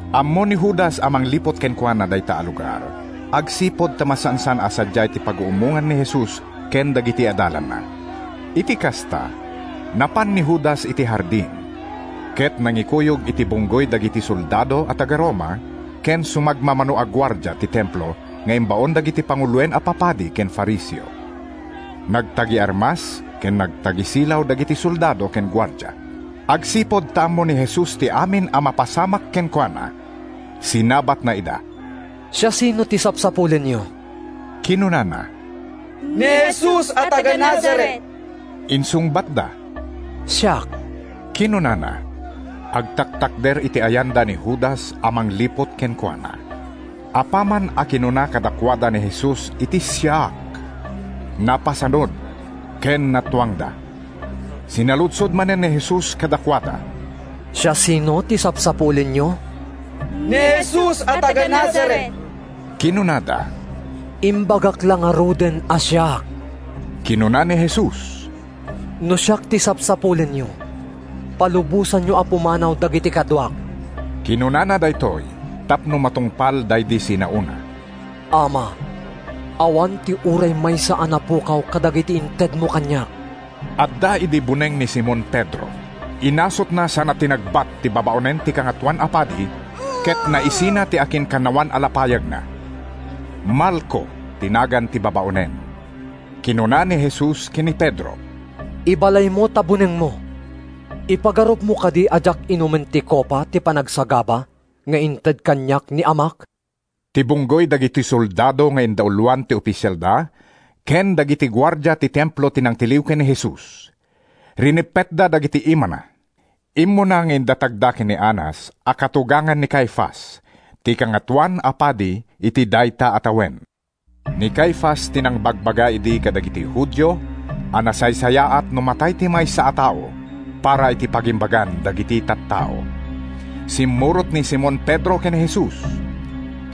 Ammo ni Judas a mangliput kenkuana dayta a lugar agsipud ta masansan a sadiay ti paguummongan ni Jesus ken dagiti adalanna. Iti kasta, napan ni Judas iti hardin, ket nangikuyog iti bunggoy dagiti soldado a taga-Roma ken sumagmamano a guardia ti Templo nga imbaon dagiti panguloen a papadi ken Fariseo. Nagtagi-armas ken nagtagi-silaw dagiti soldado ken guardia. Agsipud ta ammo ni Jesus ti amin a mapasamak kenkuana, sinabatna ida. “Siasino ti sapsapulenyo?” kinunana. “Ni Jesus a taga-Nazaret,” insungbatda. “Siak,” kinunana. Agtaktakder iti ayanda ni Judas a mangliput kenkuana. Apaman a kinuna kadakuada ni Jesus iti “Siak,” napasanud ken natuangda. Sinaludsod manen ni Jesus kadakuada, “Siasino ti sapsapulenyo?” “Ni Jesus a taga-Nazaret,” kinunada. “Imbagak la ngaruden a siak,” kinuna ni Jesus. “No siak ti sapsapulenyo, palubosanyo a pumanaw dagiti kaduak.” ( Kinunana daytoy tapno matungpal daydi sinaona: “Ama, awan ti uray maysa a napukaw kadagiti intedmo kaniak.”) Adda idi buneng ni Simon Pedro. Inasutna sana tinagbat ti babaonen ti Kangatoan a Padi, ket naisina ti akinkannawan a lapayagna. Malco ti nagan ti babaonen. Kinuna ni Jesus ken ni Pedro, “Ibalaymo ta bunengmo. Ipagarupmo kadi a diak inumen ti kopa ti panagsagaba nga inted kaniak ni Amak?” Ti bunggoy dagiti soldado nga indauloan ti ofisialda ken dagiti guardia ti Templo ti nangtiliw ken ni Jesus. Rineppetda dagiti imana. Immuna nga indatagda ken ni Anas a katugangan ni Caifas, ti Kangatoan a Padi iti dayta a tawen. Ni Caifas ti nangbagbaga idi kadagiti Judio a nasaysayaat no matay ti maysa a tao para iti pagimbagan dagiti tattao. Simmurot ni Simon Pedro ken ni Jesus.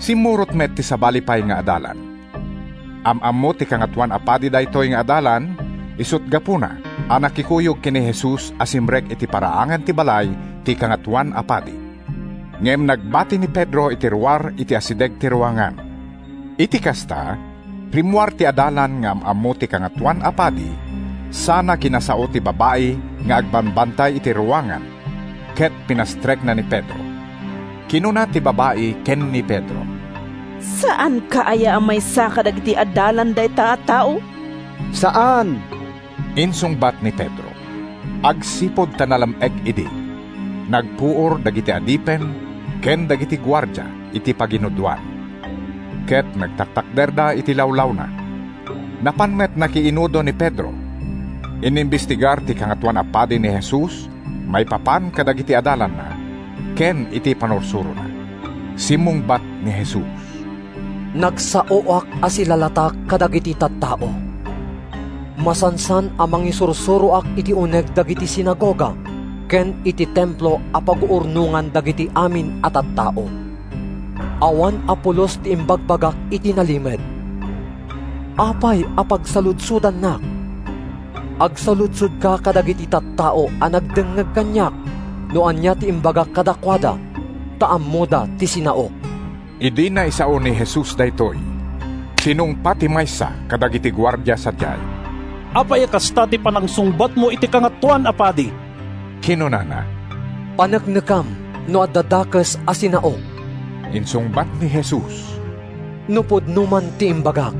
Simmurot met ti sabali pay nga adalan. Am-ammo ti Kangatoan a Padi daytoy nga adalan, isut’ gapuna a nakikuyog ken ni Jesus a simrek iti paraangan ti balay ti Kangatoan a Padi. Ngem nagbati ni Pedro iti ruar iti asideg ti ruangan. Iti kasta, rimmuar ti adalan nga am-ammo ti Kangatoan a Padi sana kinasao ti babai nga agbambantay iti ruangan ket pinastrekna ni Pedro. Kinuna ti babai ken ni Pedro, “Saanka aya a maysa kadagiti adalan dayta a tao?” “Saan,” insungbat ni Pedro. Agsipud ta nalam-ek idi, nagpuor dagiti adipen ken dagiti guardia iti paginudoan ket nagtatakderda iti lawlawna. Napan met nakiinudo ni Pedro. Inimbestigar ti Kangatoan a Padi ni Jesus maipapan kadagiti adalanna ken iti pannursurona. Simmungbat ni Jesus, “Nagsaoak a silalatak kadagiti tattao. Masansan a mangisursuroak iti uneg dagiti sinagoga ken iti Templo a paguurnongan dagiti amin a tattao. Awan a pulos ti imbagbagak iti nalimed. Apay a pagsaludsodannak? Agsaludsodka kadagiti tattao a nagdengngeg kaniak no ania ti imbagak kadakuada ta ammoda ti sinaok.” Idi naisao ni Jesus daytoy, tinungpa ti maysa kadagiti guardia sadiay. “Apay a kasta ti panangsungbatmo iti Kangatoan a Padi?” kinunana. “Paneknekam no adda dakes a sinaok,” insungbat ni Jesus. “No pudno man ti imbagak,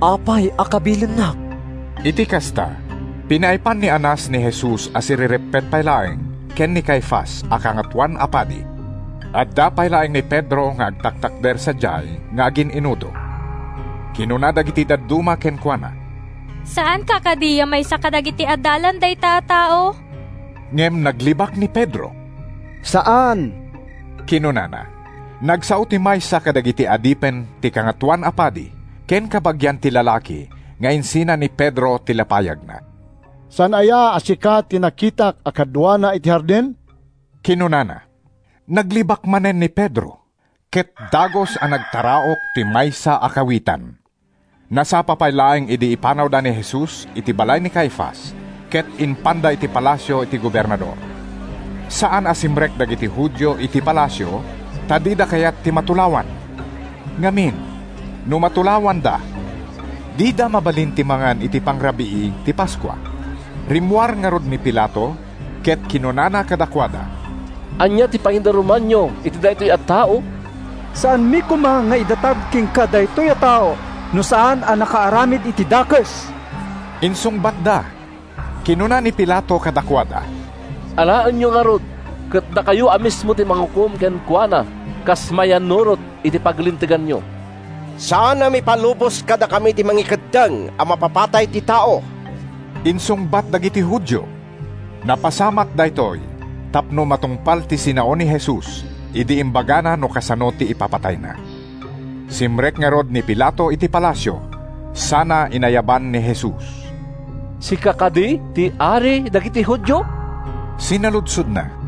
apay a kabilennak?” Iti kasta, pinaipan ni Anas ni Jesus a sirereppet pay laeng ken ni Caifas a Kangatoan a Padi. Adda pay laeng ni Pedro nga agtaktakder sadiay nga agin-inudo. Kinuna dagiti dadduma kenkuana, “Saanka kadi a maysa kadagiti adalan dayta a tao?” Ngem naglibak ni Pedro. “Saan,” kinunana. Nagsao ti maysa kadagiti adipen ti Kangatoan a Padi, ken kabagian ti lalaki nga insina ni Pedro ti lapayagna. “Saan aya a sika ti nakitak a kaduana iti hardin?” kinunana. Naglibak manen ni Pedro, ket dagus a nagtaraok ti maysa a kawitan. Nasapa pay laeng idi ipanawda ni Jesus iti balay ni Caifas ket impanda iti palasio ti gobernador. Saan a simrek dagiti Judio iti palasio ta dida kayat ti matulawan. Ngamin, no matulawanda, dida mabalin ti mangan iti pangrabii ti Paskua. Rimmuar ngarud ni Pilato ket kinunana kadakuada, “Ania ti pangidarumanyo iti daytoy a tao?” “Saanmi koma nga idatag kenka daytoy a tao no saan a nakaaramid iti dakes,” insungbatda. Kinuna ni Pilato kadakuada, “Alaenyo ngarud ket dakayo a mismo ti mangukom kenkuana kas mayannurot iti paglinteganyo.” “Saan a maipalubos kadakami ti mangikeddeng a mapapatay ti tao,” insungbat dagiti Judio. ( Napasamak daytoy tapno matungpal ti sinao ni Jesus idi imbagana no kasano ti ipapatayna.) Simrek ngarud ni Pilato iti palasio sana inayaban ni Jesus. “Sika kadi ti ari dagiti Judio?” sinaludsodna.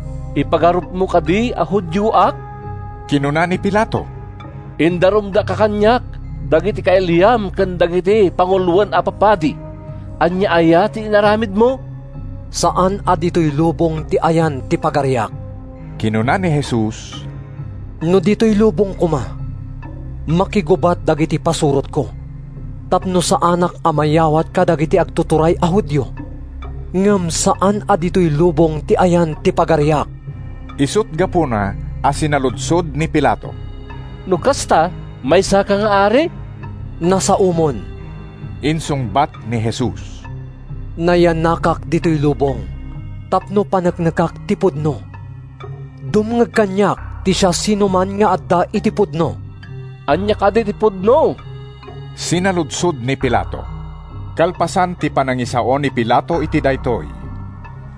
“Ipagarupmo kadi a Judioak?” kinuna ni Pilato. “Indarumdaka kaniak dagiti kailiam ken dagiti panguloen a papadi. Ania aya ti inaramidmo?” “Saan a ditoy lubong ti ayan ti pagariak,” kinuna ni Jesus. “No ditoy lubong koma, makigubat dagiti pasurotko tapno saanak a mayawat kadagiti agtuturay a Judio. Ngem saan a ditoy lubong ti ayan ti pagariak!” Isut’ gapuna a sinaludsod ni Pilato, “No kasta, maysaka nga ari?” “Nasaomon,” insungbat ni Jesus. “Nayanakak ditoy lubong tapno paneknekak ti pudno. Dumngeg kaniak ti siasinoman nga adda iti pudno.” “Ania kadi ti pudno?” sinaludsod ni Pilato. Kalpasan ti panangisao ni Pilato iti daytoy,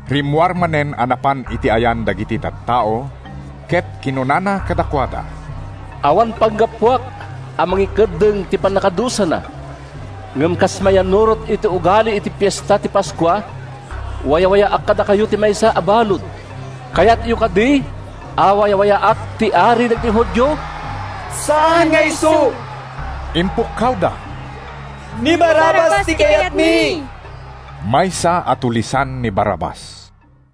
rimmuar manen a napan iti ayan dagiti tattao ket kinunana kadakuada: “Awan panggapuak a mangikeddeng iti pannakadusana. Ngem kas mayannurot iti ugaliyo iti Fiesta ti Paskua, wayawayaak kadakayo ti maysa a balud. Kayatyo kadi a wayawayaak ti ari dagiti Judio?” “Saan nga isu!” impukkawda, “Ni Barrabas ti kayatmi!” (Maysa a tulisan ni Barrabas.)